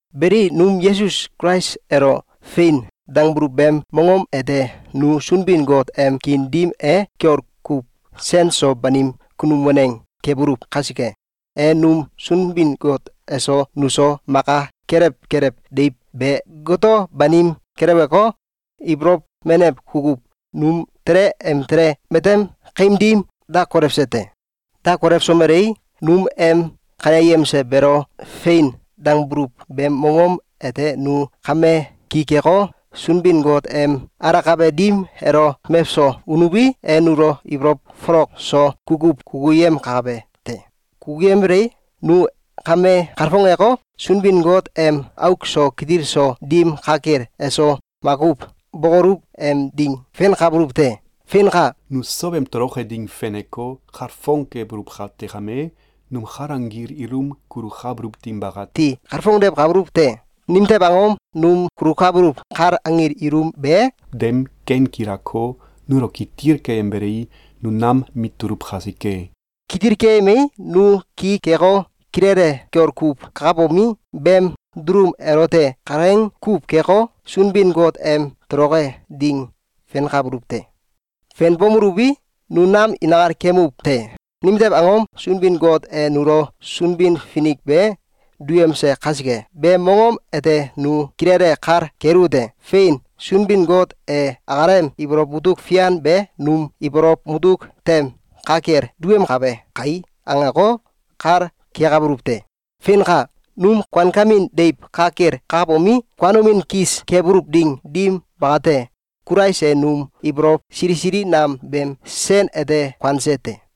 Beli, num Yesus Kulais elo “Fein!”, dangbuluw beem mongom ete nu Sunbin-Got em kiin dim e kiol kuw sen so banim kunum waneng kebuluw kasike, e num Sunbin-Got eso nuso maka kelew kelew deiw be goto banim kelewko, ibolow menew kukuw num tele em tele matem kaim dim da kolewse te. Da kolewsomelei, num em kaneyemse beelo “Fein!”, dangbuluw beem mongom ete nu kame ki keko, Sunbin-Got em alakabe dim elo mewso unuwi, e nulo ibolow folok so kukuw kukuyemkabe te. Kukuyembelei, nu kame kalfongeko, Sunbin-Got em auk so kitil so dim ka kel eso makuw bókoluw em ding fenkabuluw te. Feinka! Nu sow em toloke ding feneko, kalfong kebuluw kate kame, num kal anggil ilum kulukabuluw ding bakati kalfongdewkabuluw te. Nimtew angom? Num kulukabuluw kal anggil ilum be, dem ken gilako, nulo kitil keyembelei, nu nam mit tuluw kasike. Kitil keyemei, nu ki keko, kilele kiol kuw kakabomi, beem dulum elote kalaing kuw keko, Sunbin-Got em toloke ding fenkabuluw te. Fenbomeluwi, nu nam inkal kemuw te. Nimtew angom? Sunbin-Got e nulo Sunbin-Finik be duyemse kasike. Beem mongom ete nu kilele kal keluwete: “Fein! Sunbin-Got e akalem ibolow mutuk fian be num ibolow mutuk tem ka kel duyemkabe kai!”, angeko, kal kekabuluw te. Feinka! Num kuankemin deiw ka kel kakabomi, kuanomin kis kebuluw ding dim bakate, Kulais e num ibolow sili sili nam beem sen ete kuanse te.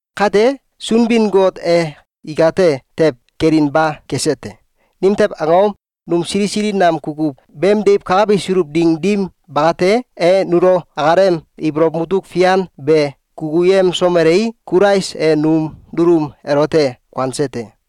Kate, Sunbin-Got e ikate tew kelinba kese te. Nimtew angom? Num sili sili nam kukuw beem deiw kakabisuluw ding dim bakate, e nulo akalem ibolow mutuk fian be kukuyemsomelei, Kulais e num dulum elote kuanse te.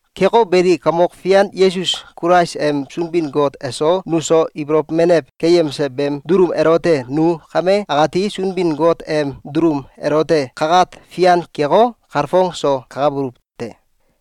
Keko beli, Kamok Fian Yesus Kulais em Sunbin-Got eso nuso ibolow menew keyemse beem dulum elote nu kame akati Sunbin-Got em dulum elote kakat fian keko, kalfong so kakabuluw te.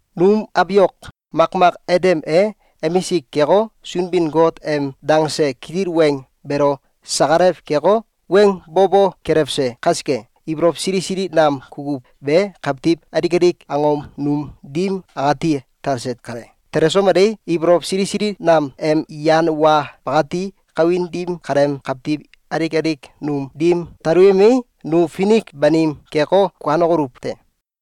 Num abiok makmak Adam e emisik keko, Sunbin-Got em dangse kitil weng beelo sakalaw keko, weng bo bo kelewse kasike, ibolow sili sili nam kukuw be kawtiw alik alik angom num dim akati talse kale. Telesomelei, ibolow sili sili nam em yan wa bakati kawin dim kaleem kawtiw alik alik num dim taluyemei, nu finik banim keko, kuanokoluw te.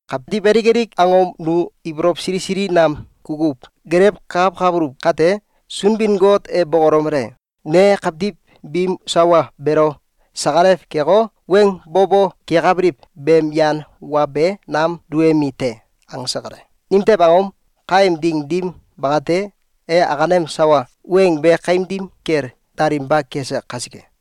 Kawtiw alik alik angom nu ibolow sili sili nam kukuw gelewkakawkabuluw kate, Sunbin-Got e bokolomele: “Ne kawtiw biim sawa beelo sakalaw keko, weng bo bo kekabiliw beem yan wa be nam duyemi te!”, angse kale. Nimtew angom? Kaem ding dim bakate, e akalem sawa weng be kaim dim kel dalinba kese kasike.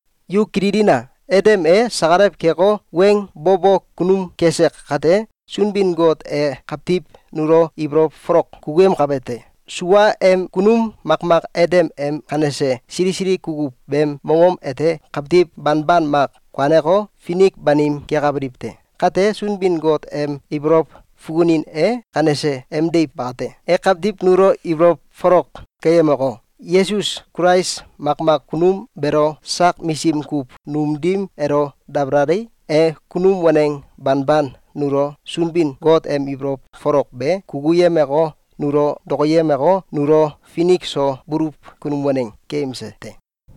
Yu kililina! Adam e sakalaw keko, weng bo bo kunum kese kate, Sunbin-Got e kawtiw nulo ibolow folok kukuyemkabe te. Sua em kunum makmak Adam em kanese sili sili kukuw beem mongom ete kawtiw banban mak kuaneko, finik banim kekabiliw te. Kate, Sunbin-Got em ibolow fukunin e kanese emdiw bate. E kawtiw nulo ibolow folok keyemeko, Yesus Kulais makmak kunum beelo sak misim kuw num dim elo dabalalei, e kunum waneng banban nulo Sunbin-Got em ibolow folok be kukuyemeko, nulo dokoyemeko, nulo finik so buluw kunum waneng keyemse te.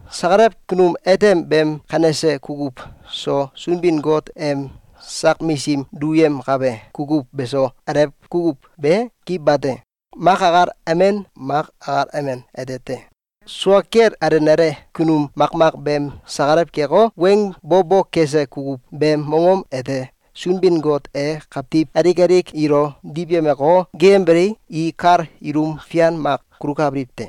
Sakalaw kunum Adam beem kanese kukuw so, Sunbin-Got em sak misim duyemkabe kukuw beso, alew kukuw be ki bate. Mak akal amen mak akal amen ete te. Sua kel alenale kunum makmak beem sakalaw keko, weng bo bo kese kukuw beem mongom ete Sunbin-Got e kawtiw alik alik ilo diwyemeko, geeyembelei, i kal ilum fian mak kulukabiliw te.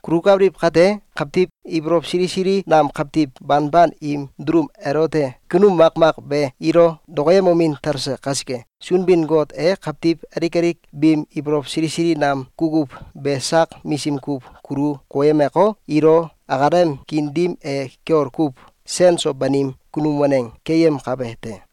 Kulukabiliw kate, kawtiw ibolow sili sili nam kawtiw banban im dulum elote kunum makmak be ilo dokoyemomin talse kasike, Sunbin-Got e kawtiw alik alik biim ibolow sili sili nam kukuw be sak misim kuw kulu koyemeko, ilo akalem kiin dim e kiol kuw sen so banim kunum waneng keyemkabe te.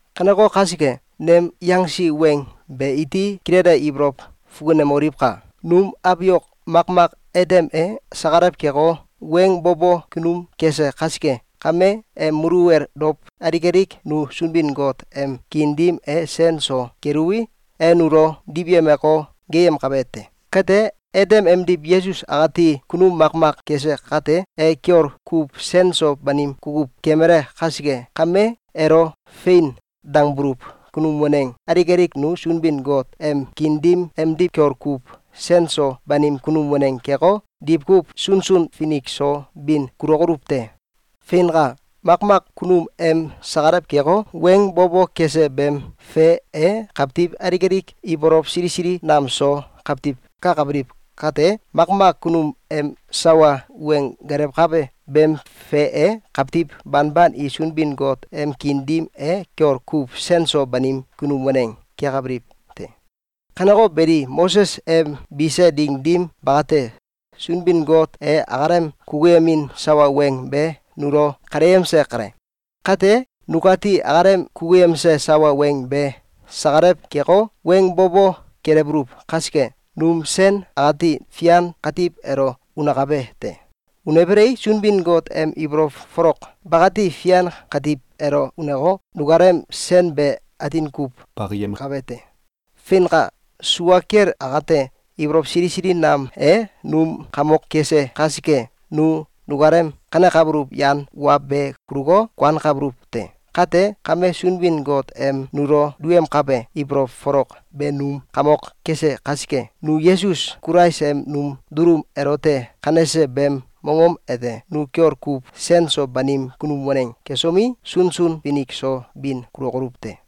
Kaneko kasike, nem yangsi weng be iti kilele ibolow fukunemoliwka! Num abiok makmak Adam e sakalaw keko, weng bo bo kunum kese kasike kame, em muluwel dow alik alik nu Sunbin-Got em kiin dim e sen so keluwi, e nulo diwyemeko, geeyemkabe te. Kate, Adam emdiw Yesus akati kunum makmak kese kate, e kiol kuw sen so banim kukuw kemale kasike kame, elo “Fein!”, dangbuluw kunum waneng alik alik nu Sunbin-Got em kiin dim emdiw kiol kuw sen so banim kunum waneng keko, diwkuw sunsun finik so bin kulokoluw te. Feinka! Makmak kunum em sakalaw keko, weng bo bo kese beem fe e kawtiw alik alik ibolow sili sili nam so kawtiw kakabiliw kate, makmak kunum em sawa weng gelewkabe beem fe e kawtiw banban i Sunbin-Got em kiin dim e kiol kuw sen so banim kunum waneng kekabiliw te. Kaneko beli, Moses em bise ding dim bakate, Sunbin-Got e akalem kukuyemin sawa weng be nulo kaleyemse kale. Kate, nukati akalem kukuyemse sawa weng be sakalaw keko, weng bo bo kelewbuluw kasike, num sen akati fian katiw elo unakabe te. Unbelei, Sunbin-Got em ibolow folok bakati fian katiw elo uneko, nukalem sen be atin kuw bakiyemkabe te. Feinka! Sua kel akate, ibolow sili sili nam e num kamok kese kasike, nu nukalem kanekabuluw yan wa be kuluko, kuankabuluw te. Kate kame, Sunbin-Got em nulo duyemkabe ibolow folok be num kamok kese kasike, nu Yesus Kulais em num dulum elote kanese beem mongom ete nu kiol kuw sen so banim kunum waneng kesomi, sunsun finik so bin kulokoluw te.